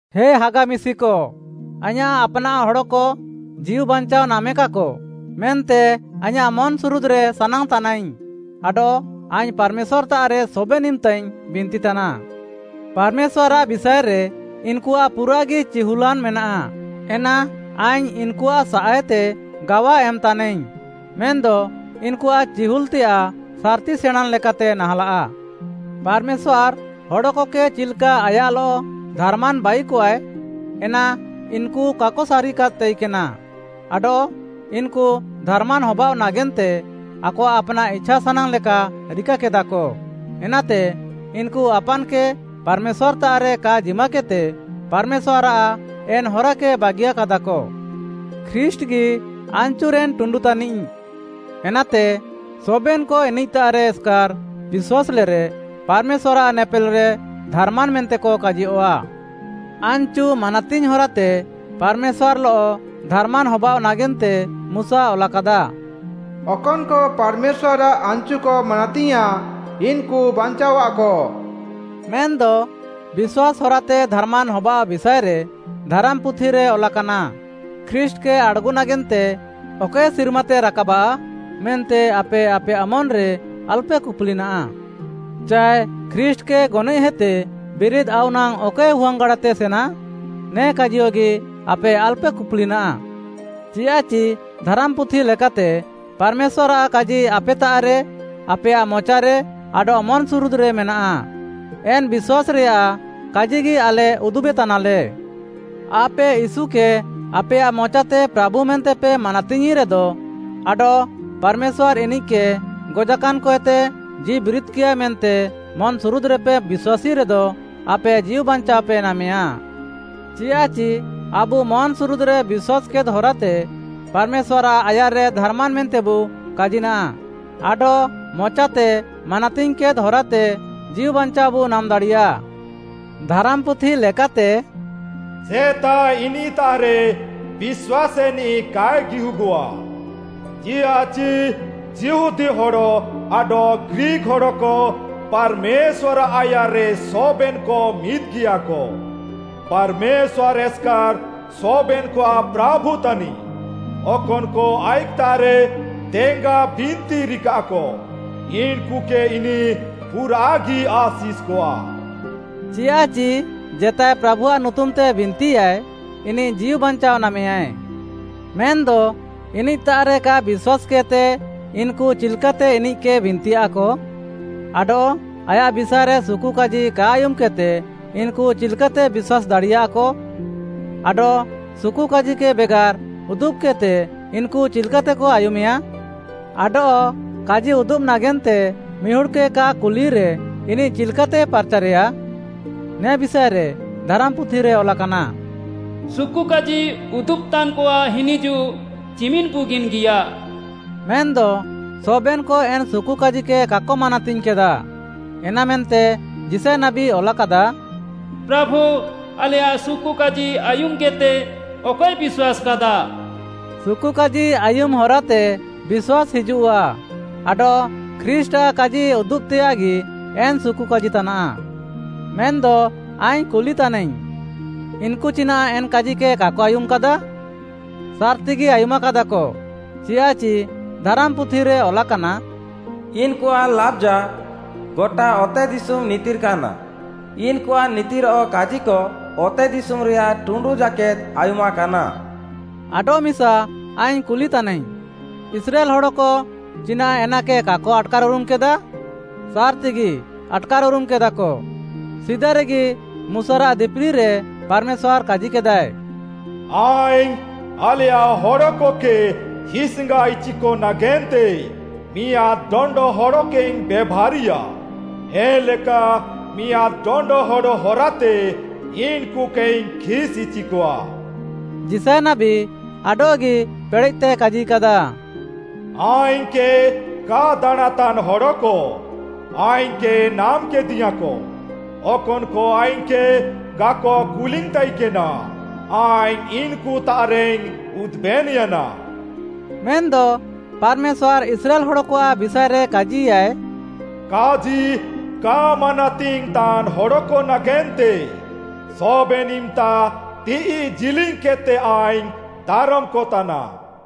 ହେ ହାଗା ମିଶିକ, ଆଇଁୟାଃ ଆପ୍‌ନାଃ ହଡ଼କ ଜୀଉବାଞ୍ଚାଅ ନାମେକାକ, ମେନ୍ତେ ଆଇଁୟାଃ ମନ୍‌ସୁରୁଦ୍‌ରେ ସାନାଙ୍ଗ୍‌ତାନାଇଙ୍ଗ୍‌ ଆଡଃ ଆଇଙ୍ଗ୍‌ ପାର୍‌ମେଶ୍ୱାର୍‌ତାଃରେ ସବେନ୍‌ ଇମ୍‌ତାଇଙ୍ଗ୍‌ ବିନ୍ତିତାନା। ପାର୍‌ମେଶ୍ୱାର୍‌ଆଃ ବିଷାଏରେ ଇନ୍‌କୁଆଃ ପୁରାଃଗି ଚିହୁଲ୍‌ଲାନ୍‌ ମେନାଃ, ଏନା ଆଇଙ୍ଗ୍‌ ଇନ୍‌କୁଆଃ ସାଃଏତେ ଗାୱା ଏମ୍‌ତାନାଇଙ୍ଗ୍‌, ମେନ୍‌ଦ ଇନ୍‌କୁଆଃ ଚିହୁଲ୍‌ତେୟାଃ ସାର୍‌ତି ସେଣାଁଁନ୍‌ ଲେକାତେ ନାହାଁଲାଃ। ପାର୍‌ମେଶ୍ୱାର୍‌ ହଡ଼କକେ ଚିଲ୍‌କା ଆୟାଃଲଃ ଧାର୍‌ମାନ୍‌ ବାଇକଆଏ, ଏନା ଇନ୍‌କୁ କାକ ସାରିକାଦ୍‌ ତାଇକେନା ଆଡଃ ଇନ୍‌କୁ ଧାର୍‌ମାନ୍‌ ହବାଅଃ ନାଗେନ୍ତେ ଆକଆଃ ଆପ୍‌ନାଃ ଇଛାସାନାଙ୍ଗ୍‌ ଲେକା ରିକାକେଦାକ, ଏନାତେ ଇନ୍‌କୁ ଆପାନ୍‌କେ ପାର୍‌ମେଶ୍ୱାର୍‌ତାଃରେ କା ଜିମାକେଦ୍‌ତେ ପାର୍‌ମେଶ୍ୱାର୍‌ଆଃ ଏନ୍‌ ହରାକେ ବାଗିୟାକାଦାକ। ଖ୍ରୀଷ୍ଟ୍‌ଗି ଆନ୍‌ଚୁରେନ୍‌ ଟୁଣ୍ଡୁ ତାନିଃ, ଏନାତେ ସବେନ୍‌କ ଇନିଃତାଃରେ ଏସ୍‌କାର୍‌ ବିଶ୍ୱାସ୍‌ଲେରେ ପାର୍‌ମେଶ୍ୱାର୍‌ଆଃ ନେପେଲ୍‌ରେ ଧାର୍‌ମାନ୍‌ ମେନ୍ତେକ କାଜିୟଃଆ। ଆନ୍‌ଚୁ ମାନାତିଙ୍ଗ୍‌ ହରାତେ ପାର୍‌ମେଶ୍ୱାର୍‌ଲଃ ଧାର୍‌ମାନ୍‌ ହବାଅଃ ନାଗେନ୍ତେ ମୁଶା ଅଲାକାଦା, “ଅକନ୍‌କ ପାର୍‌ମେଶ୍ୱାର୍‌ଆଃ ଆନ୍‌ଚୁକ ମାନାତିୟାଁଃ, ଇନ୍‌କୁ ବାଞ୍ଚାଅଃଆକ।” ମେନ୍‌ଦ ବିଶ୍ୱାସ୍‌ ହରାତେ ଧାର୍‌ମାନ୍‌ ହବାଅଃ ବିଷାଏରେ ଧାରାମ୍‌ପୁଥିରେ ଅଲାକାନା, “ଖ୍ରୀଷ୍ଟ୍‌କେ ଆଡ଼୍‌ଗୁ ନାଗେନ୍ତେ ଅକଏ ସିର୍ମାତେ ରାକାବା? ମେନ୍ତେ ଆପେ ଆପେୟାଃ ମନ୍‌ରେ ଆଲ୍‌ପେ କୁପୁଲିନାଃ।” ଚାଏ, “ଖ୍ରୀଷ୍ଟ୍‌କେ ଗନଏଃହେତେ ବିରିଦ୍‌ ଆଉ ନାଙ୍ଗ୍‌ ଅକଏ ହୁଆଙ୍ଗ୍‌ଗାଡ଼ାତେ ସେନା?” ନେ କାଜିୟଗି ଆପେ ଆଲ୍‌ପେ କୁପୁଲିନାଃ। ଚିୟାଃଚି ଧାରାମ୍‌ପୁଥି ଲେକାତେ, “ପାର୍‌ମେଶ୍ୱାର୍‌ଆଃ କାଜି ଆପେତାଃରେ, ଆପେୟାଃ ମଚାରେ ଆଡଃ ମନ୍‌ସୁରୁଦ୍‌ରେ ମେନାଃ।” ଏନ୍‌ ବିଶ୍ୱାସ୍‌ରେୟାଃ କାଜିଗି ଆଲେ ଉଦୁବେତାନାଲେ। ଆପେ ୟୀଶୁକେ ଆପେୟାଃ ମଚାତେ ପ୍ରାଭୁ ମେନ୍ତେପେ ମାନାତିଙ୍ଗ୍‌ରେଦ ଆଡଃ ପାର୍‌ମେଶ୍ୱାର୍‌ ଇନିଃକେ ଗଜାକାନ୍‌କଏତେ ଜୀଉବିରିଦ୍‌କିୟାଏ ମେନ୍ତେ ମନ୍‌ସୁରୁଦ୍‌ରେପେ ବିଶ୍ୱାସେ ରେଦ, ଆପେ ଜୀଉ ବାଞ୍ଚାଅପେ ନାମେୟାଁ। ଚିଆଃଚି ଆବୁ ମନ୍‌ସୁରୁଦ୍‌ରେ ବିଶ୍ୱାସ୍‌କେଦ୍‌ ହରାତେ ପାର୍‌ମେଶ୍ୱାର୍‌ଆଃ ଆୟାର୍‌ରେ ଧାର୍‌ମାନ୍‌ ମେନ୍ତେବୁ କାଜିନାଃ ଆଡଃ ମଚାତେ ମାନାତିଙ୍ଗ୍‌କେଦ୍‌ ହରାତେ ଜୀଉବାଞ୍ଚାଅବୁ ନାମ୍‌ଦାଡ଼ିୟା। ଧାରାମ୍‌ପୁଥି ଲେକାତେ, “ଜେତାଏ ଇନିଃତାଃରେ ବିଶ୍ୱାସେନିଃ କାଏ ଗିହୁଗଃଆ। ଚିଆଃଚି ଯିହୁଦୀ ହଡ଼ ଆଡଃ ଗ୍ରୀକ୍‌ ହଡ଼କ ପାର୍‌ମେଶ୍ୱାର୍‌ଆଃ ଆୟାର୍‌ରେ ସବେନ୍‌କ ମିଦ୍‌ଗିୟାକ। ପାର୍‌ମେଶ୍ୱାର୍‌ ଏସ୍‌କାର୍‌ ସବେନ୍‌କଆଃ ପ୍ରାଭୁ ତାନିଃ, ଅକନ୍‌କ ଆଇଃକ୍‌ତାଃରେ ଦେଙ୍ଗା ବିନ୍ତି ରିକାଃକ ଇନ୍‌କୁକେ ଇନିଃ ପୁରାଃଗି ଆଶିଷ୍‌କଆ।” ଚିଆଃଚି ଜେତାଏ ପ୍ରାଭୁଆଃ ନୁତୁମ୍‌ତେ ବିନ୍ତିୟାଏ, ଇନିଃ ଜୀଉବାଞ୍ଚାଅ ନାମେୟାଁଏ। ମେନ୍‌ଦ ଇନିଃତାଃରେ କା ବିଶ୍ୱାସ୍‌କେଦ୍‌ତେ ଇନ୍‌କୁ ଚିଲ୍‌କାତେ ଇନିଃକେ ବିନ୍ତିୟାକ? ଆଡଃ ଆୟାଃ ବିଷାଏରେ ସୁକୁକାଜି କା ଆୟୁମ୍‌କେଦ୍‌ତେ ଇନ୍‌କୁ ଚିଲ୍‌କାତେ ବିଶ୍ୱାସ୍‌ ଦାଡ଼ିୟାକ? ଆଡଃ ସୁକୁକାଜିକେ ବେଗାର୍‌ ଉଦୁବ୍‌କେଦ୍‌ତେ ଇନ୍‌କୁ ଚିଲ୍‌କାତେକ ଆୟୁମେୟା? ଆଡଃ କାଜି ଉଦୁବ୍‌ ନାଗେନ୍ତେ ମିହୁଡ଼୍‌କେ କା କୁଲିରେ ଇନିଃ ଚିଲ୍‌କାତେ ପାର୍‌ଚାର୍‌ରେୟା? ନେ ବିଷାଏରେ ଧାରାମ୍‌ପୁଥିରେ ଅଲାକାନା, “ସୁକୁକାଜି ଉଦୁବ୍‌ତାନ୍‌କଆଃ ହିନିଜୁଃ ଚିମିନ୍‌ ବୁଗିନ୍‌ଗିୟା?” ମେନ୍‌ଦ ସବେନ୍‌କ ଏନ୍‌ ସୁକୁକାଜିକେ କାକ ମାନାତିଙ୍ଗ୍‌କାଦା। ଏନାମେନ୍ତେ ଯିଶାୟ ନାବୀ ଅଲାକାଦା, “ପ୍ରାଭୁ, ଆଲେୟାଃ ସୁକୁକାଜି ଆୟୁମ୍‌କେଦ୍‌ତେ ଅକଏ ବିଶ୍ୱାସ୍‌କାଦା?” ସୁକୁକାଜି ଆୟୁମ୍‌ ହରାତେ ବିଶ୍ୱାସ୍‌ ହିଜୁଃଆ ଆଡଃ ଖ୍ରୀଷ୍ଟ୍‌ଆଃ କାଜି ଉଦୁବ୍‌ତେୟାଃଗି ଏନ୍‌ ସୁକୁକାଜି ତାନାଃ। ମେନ୍‌ଦ ଆଇଙ୍ଗ୍‌ କୁଲି ତାନାଇଙ୍ଗ୍‌, ଇନ୍‌କୁ ଚିନାଃ ଏନ୍‌ କାଜିକେ କାକ ଆୟୁମାକାଦା? ସାର୍‌ତିଗି ଆୟୁମାକାଦାକ, ଚିୟାଃଚି ଧାରାମ୍‌ପୁଥିରେ ଅଲାକାନା, “ଇନ୍‌କୁଆଃ ଲାବ୍‌ଜା ଗଟା ଅତେଦିଶୁମ୍‌ ନିତିର୍‌କାନା, ଇନ୍‌କୁଆଃ ନିତିର୍‌ଅଃ କାଜିକ ଅତେଦିଶୁମ୍‌ରେୟାଃ ଟୁଣ୍ଡୁ ଜାକେଦ୍‌ ଆୟୁମାକାନା।” ଆଡଃମିସା ଆଇଙ୍ଗ୍‌ କୁଲି ତାନାଇଙ୍ଗ୍‌, ଇସ୍ରାଏଲ୍‌ ହଡ଼କ ଚିନାଃ ଏନାକେ କାକ ଆଟ୍‌କାର୍‌ଉରୁମ୍‌କେଦା? ସାର୍‌ତିଗି ଆଟ୍‌କାର୍‌ଉରୁମ୍‌କେଦାକ, ସିଦାରେଗି ମୁଶାରାଃ ଦିପିଲିରେ ପାର୍‌ମେଶ୍ୱାର୍‌ କାଜିକେଦାଏ, “ଆଇଙ୍ଗ୍‌ ଆଲେୟାଃ ହଡ଼କକେ ହିସ୍‌ଙ୍ଗାଇଚିକ ନାଗେନ୍ତେ ମିଆଁଦ୍‌ ଡଣ୍ଡ ହଡ଼କେଇଙ୍ଗ୍‌ ବେଭାରିୟା, ଏନ୍‌ଲେକା ମିଆଁଦ୍‌ ଡଣ୍ଡ ହଡ଼ ହରାତେ ଇନ୍‌କୁକେଇଙ୍ଗ୍‌ ଖିସ୍‌ଇଚିକଆ।” ଯିଶାୟ ନାବୀ ଆଡଃଗି ପେଡ଼େଃତେ କାଜିକାଦା, “ଆଇଙ୍ଗ୍‌କେ କା ଦାଣାଁଁତାନ୍‌ ହଡ଼କ, ଆଇଙ୍ଗ୍‌କେ ନାମ୍‌କେଦିୟାଁକ, ଅକନ୍‌କ ଆଇଙ୍ଗ୍‌କେ କାକ କୁଲିଙ୍ଗ୍‌ତାଇକେନା, ଆଇଙ୍ଗ୍‌ ଇନ୍‌କୁତାଃରେଇଙ୍ଗ୍‌ ଉଦୁବେନ୍‌ୟାନା।” ମେନ୍‌ଦ ପାର୍‌ମେଶ୍ୱାର୍‌ ଇସ୍ରାଏଲ୍‌ ହଡ଼କଆଃ ବିଷାଏରେ କାଜିୟାଃଏ, “କାଜି କା ମାନାତିଙ୍ଗ୍‌ତାନ୍‌ ହଡ଼କ ନାଗେନ୍ତେ ସବେନ୍‌ ଇମ୍‌ତା ତିଃଇ ଜିଲିଙ୍ଗ୍‌କେଦ୍‌ତେ ଆଇଙ୍ଗ୍‌ ଦାରମ୍‌କତାନା।”